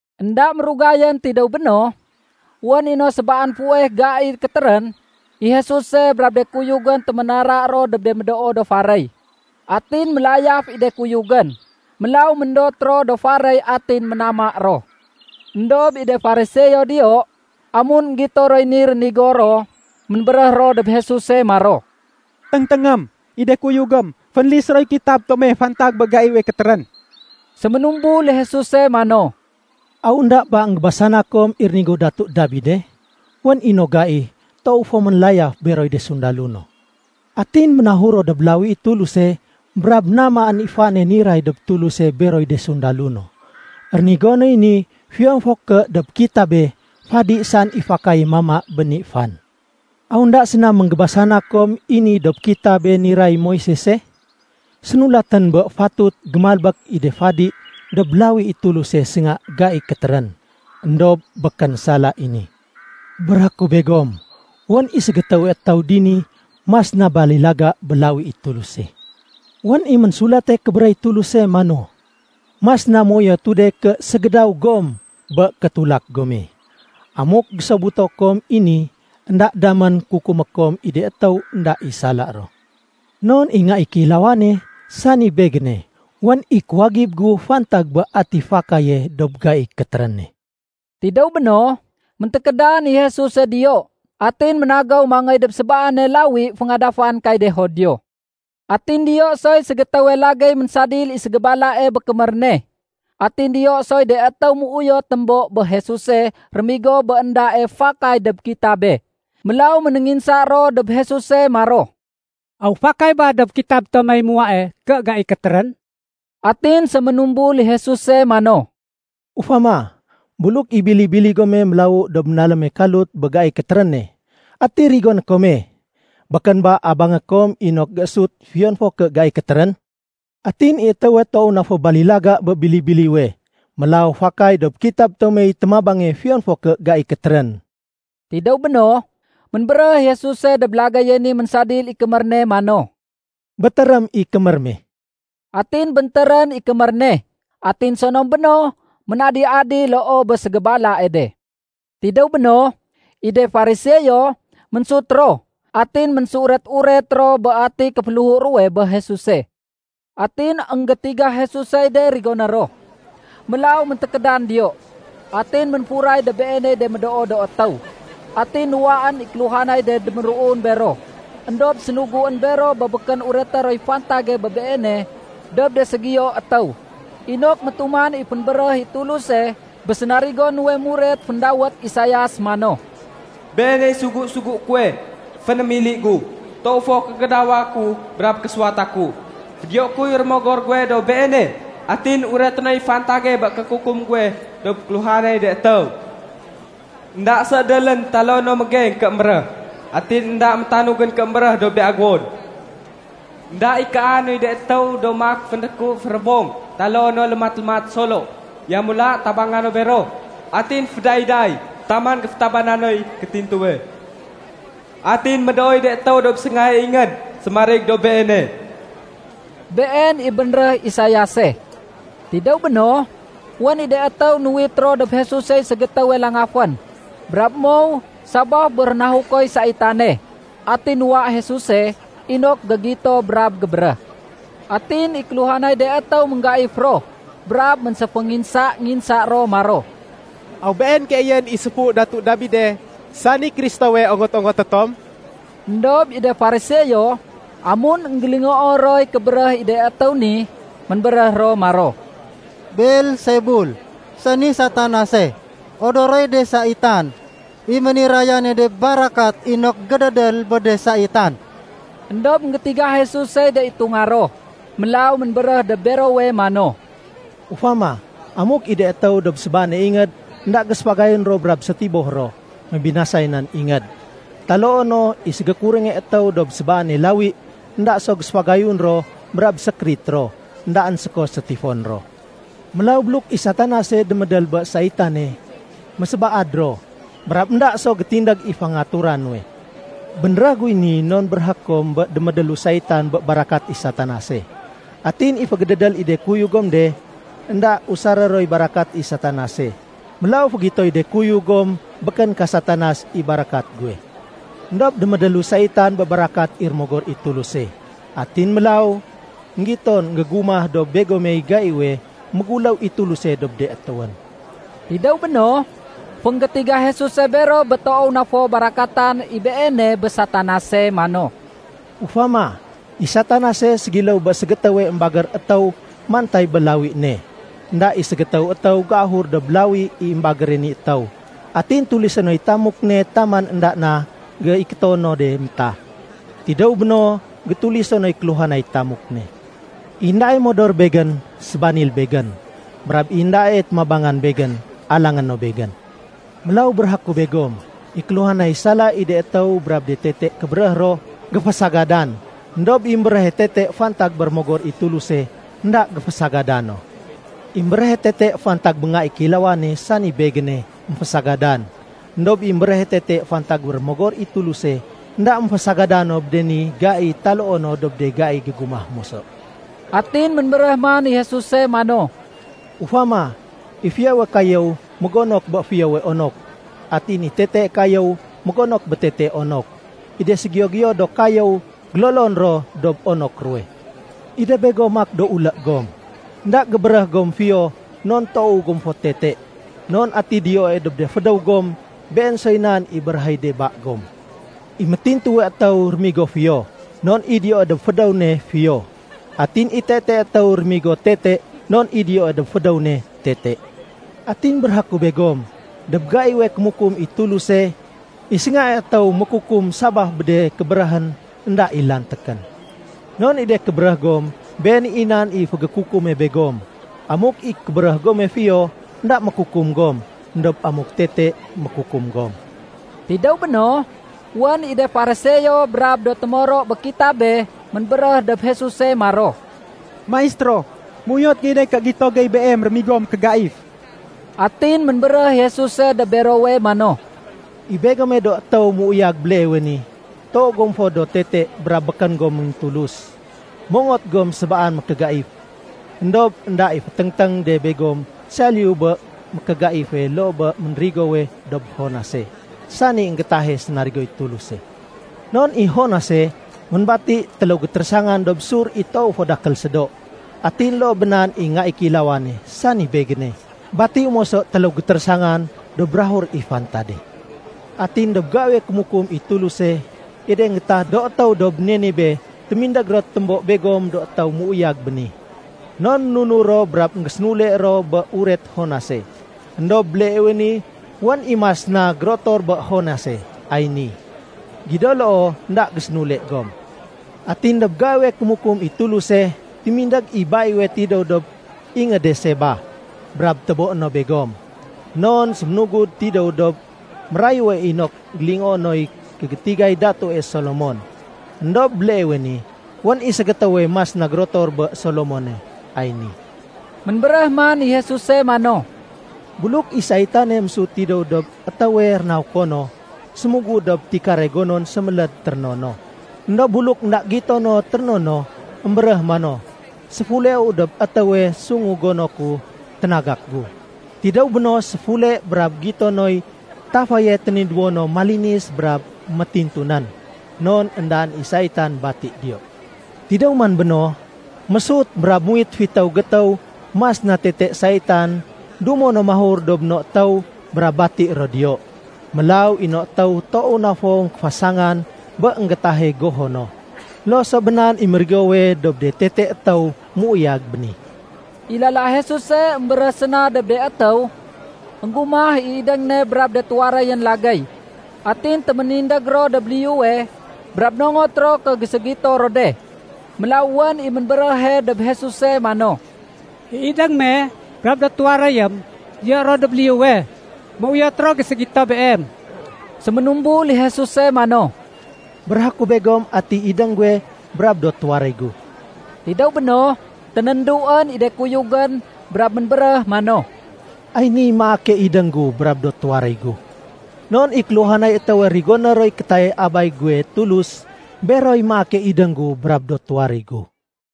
Enda mérugayén tidéw béno, wén i no sébaan fuweh gai kétérén, i Jesuse brab de kuyugén téménara ro dob de médoo do faréy. Atin mélayaf i de kuyugén, mélaw méndot ro do faréy atin ménama ro. Endob i de Fariseo diyo, amun énggito roy ni rénigo ro, ménbéréh ro dob Jesuse maro, “Téngténgém! I de kuyugém fénlis roy kitab tome fantag bé gaiwe kétérén.” Séménumbul i Jesuse mano, “Aw énda ba énggébasana kom i rénigo Datu Dabide? Wén i no gai toow fo ménlayaf beroy de sundalo no. Atin ménahur ro dob lawi i Tuluse brab namaén i fane niray dob Tuluse beroy de sundalo no. Rénigo noy ni fiyon fo ké dob kitabe, fadi saén i fakaye mama bé ni fan. Aw énda séna énggébasana kom i ni dob kitabé niray Moisese? Sénulatén bé fatut gémalbék i de fadi dob lawi i Tuluse sénga gai kétérén. Endob békén sala i ni. Béréhé ku begom, wén i ségétéwe étéw dini mas na balilaga bé lawi i Tuluse. Wén i Ménsulate Kébéréh i Tuluse mano, ‘Mas na méuyotu de ké ségédaw gom bé kétulak gome.’ Amuk énggésobuto kom i ni, énda damén kukumé kom i de étéw énda i sala ro. Non i Nga i Kéilawane, sani Begéne, wén i kuwagib gu fantag bé ati fakaye dob gaiy kétéréne.” Tidéw béno, méntékédan i Jesuse diyo atin ménagéw mangéy dob sébaane lawi féngadafan kay de Judio. Atin diyo soy ségétéwe lagéy ménsadil i ségébalae bé kémér ne. Atin diyo soy de étéw méuyot témbo bé Jesuse rémigo bé éndae fakay dob kitabe. Mélaw ménénginsa ro dob Jesuse maro, “Aw fakay ba dob kitab tomey muwae ké gai kétérén?” Atin séménumbul i Jesuse mano, “Ufama, buluk i bili-bili gome mélawu dob ménaléme kalut bé gai kétéréne, ati rigoné kome? Békén ba abangé kom inok géésut fiyon fo ké gai kétérén? Atin i étéwe toow na fo balilaga bé bili-biliwe! Mélaw fakay dob kitab tomey témabange fiyon fo ké gai kétérén.” Tidéw béno, ménbéréh i Jesuse dob lagéye ni ménsadil i kémér ne mano, “Bétérém i kémér me.” Atin béntérén i kémér ne, atin sonom béno ménadi-adi loo bé ségébalae de. Tidéw béno, i de Fariseo ménsut ro, atin ménséuret-uret ro bé ati kéféléhu ruwe bé Jesuse. Atin énggétiga Jesusey de rigoné ro, mélaw méntékédan diyo. Atin ménfuray dob Beeney de médoo do étéw. Atin nuwaén i kéluhanay de déméruun bero. Endob sénuguén bero bé békén ureté roy fantage bé Beene dob de ségiyo étéw, inok métuman i fénbéréh i Tuluse bé sénarigo nuwe muret féndawét Isaias mano, “Beeney sugu-sugué kuwe fénémili gu. Toow fo kégédawa ku brab késuwata ku. Fédiyoé kuy Rémogor guwe dob Beene, atin ureté noy fantage bé kékukum guwe dob kéluhanay de étéw. Enda séédélén taloo no mégeng ké émbéréh, atin énda métanugén ké émbéréh dob de aguwon. Enda ikaa noy de étéw do maak fénréku férébong taloo no lémat-lémat solo. Yamula tabanga no bero. Atin fédayday taman géfétabana noy kétintuwe. Atin médooy de étéw dob séngae ingéd sémarig dob Beene.” Been i bénréh Isaiase. Tidéw béno, wén i de étéw nuwit ro dob Jesusey ségétéwe langafén brab mow sabaf bé rénahukoy saitane. Atin nuwa Jesuse inok gégito brab gébéréh. Atin i kéluhanay de étéw ménggaif ro brab ménséfénginsa-nginsa ro maro, “Aw Been keeyén i séfu Datu Dabide, sani Kristowe ongot-ongoté tom?” Endob i de Fariseo, amun énggélingoo roy kébéréh i de étéw ni, ménbéréh ro maro, “Beelsebul, sani Satanase, odoroy de saitan, i ménirayane de barakat inok gédédél bé de saitan.” Endob énggétiga Jesusey de itunga ro, mélaw ménbéréh dob berowe mano, “Ufama, amuk i de étéw dob sébaane ingéd énda géséfagayun ro brab sétiboh ro, mébinasay nan ingéd. Taloo no i ségékurénge étéw dob sébaane lawi énda so géséfagayun ro brab sékérit ro, éndaén séko sétifon ro. Mélaw buluk i Satanase démédél bé saitane, mésébaad ro brab énda so gétindég i fangangatura nuwe. Bénréh guy ni non béréhé kom i démédélu saitan bé barakat i Satanase. Atin i fégédédél i de kuyug gom de, énda usaré roy barakat i Satanase. Mélaw fégitoy de kuyug gom békén ka Satanas i barakat guwe. Endob démédélu saitan bé barakat i Rémogor i Tuluse. Atin mélaw énggiton énggégumah dob begomey gaiwe méguléw i Tuluse dob de étéwén.” Tidéw béno, fénggétiga Jesuse bero bé toow na fo barakatan i Beene bé Satanase mano, “Ufama, i Satanase ségiléw bé ségétéwe émbagér étéw mantay bé lawi ne. Enda i ségétéw étéw géahur dob lawi i émbagére ni étéw atin tulisé noy tamuk ne taman énda na géikéto no de na métah. Tidéw béno, gétuliso noy kéluhanay tamuk ne. “I éndae modor Begén, sébanil Begén. Brab i éndae témabangan Begén, alangé no Begén. Mélaw béréhé ku begom, i kéluhanay sala i de étéw brab de tete kébéréh ro, géfésagadan. Endob i émbéréhe tete fantag bé Rémogor i Tuluse, énda géfasagada no. I émbéréhe tete fantag bé Nga i Kéilawane, sani Begéne, émfésagadan. Endob i émbéréhe tete fantag bé Rémogor i Tuluse, énda émfésagada no bé de ni gai taloo no dob de gai gégumah moso.” Atin ménbéréh man i Jesuse mano, “Ufama, i fiyowe kayéw mégonok bé fiyowe onok, atin i tetee kayéw mégonok bé tetee onok. I de séségiyo-giyo do kayéw gélolon ro dob onok ruwe. I de begom maak do ulé gom. Enda gébéréh gom fiyo non toow gom fo tete. Non ati diyoe dob de fédéw gom, been soy nan i béréhéy de ba gom. I métintuwe étéw rémigo fiyo, non i diyoe dob fédéw ne fiyo. Atin i tetee étéw rémigo tete non i diyoe dob fédéw ne tete. “Atin béréhé ku begom, dob gaiwe kémukum i Tuluse, i séngae étéw mékukum sabaf bé de kébéréhén énda i lantékén. Non i de kébéréh gom, been i nan i fégékukume begom. Amuk i kébéréh gome fiyo, énda mékukum gom. Endob amuk tete, mékukum gom.” Tidéw béno, wén i de Fariseo brab do témoro bé kitabé ménbéréh dob Jesuse maro, “Maistéro, méuyot gey de ké gito gey Beem rémigo mékégaif.” Atin ménbéréh i Jesuse dob berowe mano, “I begome do étéw méuyag béleewe ni, toow gom fo do tete brab békén gom méngintulus. Mongot gom sébaan mékégaif. Endob énda i féténg-téng de begom saliyu bé mékégaife loo bé ménrigowe dob Jonase, sani énggétahe sénarigoy Tuluse. Non i Jonase, ménbati téléw gétérésangan dob sur i toowe fo dakél sédo. Atin loo bé nan i Nga i Kéilawane, sani Begéne, batiu moso téléw gétérésangan dob bukag i fantade. Atin dob gaiwe kémukum i Tuluse, i de énggétah do étéw dob Ninibé témindég ro témbo begom do étéw méuyag béni. Non ménunur ro brab énggésénule ro bé uret Jonase. Endob béleewe ni, wén i mas na gérotor bé Jonase ay ni. Gido loo énda gésénule gom. Atin dob gaiwe kémukum i Tuluse, témindég i baiwe tidéw dob ingéde Seba, brab téboé no begom. Non séménugud tidéw dob mérayue inok fégélingoé noy kégétigay Datue Solomon. Endob béleewe ni wén i ségétéwe mas na gérotor bé Solomone ay ni.” Ménbéréh man i Jesuse mano, “Buluk i saitane mésut tidéw dob étéwe rénahuko no, sémugud dob tikare gonon séméléd téréno no. Endob buluk énda i gito no téréno no, émbéréh mano, ‘Séfuleu dob étéwe sungu gono ku ténagak gu.’ Tidéw béno, séfule brab gito noy tafaye ténidéwo no malinis brab métintu nén, non énda i saitan bati diyo. Tidéw man béno, mésut brab muwit fitéw gétéw mas na tete saitan dumo no mahur dob no étéw brab bati ro diyo. Mélaw i no étéw toow na fo kéfasangan bé énggétahe goho no. Loo so bé nan i mérigowe dob de tete étéw méuyag béni.” I lala Jesuse émbéréh séna dob de étéw, énggumah i idéng ne brab de tuwaréyén lagéy. Atin téménindég ro dob liyuwe brab nongot ro ké géségito ro de. Mélaw wén i ménbéréhe dob Jesuse mano, “I idéng me brab do tuwaréyém diyo ro dob liyuwe. Méuyot ro géségito Beem.” Séménumbul i Jesuse mano, “Béréhé ku begom atiy idéng guwe brab do tuwaréy gu.” Tidéw béno, ténénduén i de kuyugén brab ménbéréh mano, “Ay niy maake idéng gu brab do tuwaréy gu. Non i kéluhanay étéwe rigoné roy kétayay Abay guwe Tulus, beroy maake idéng gu brab do tuwaréy gu.”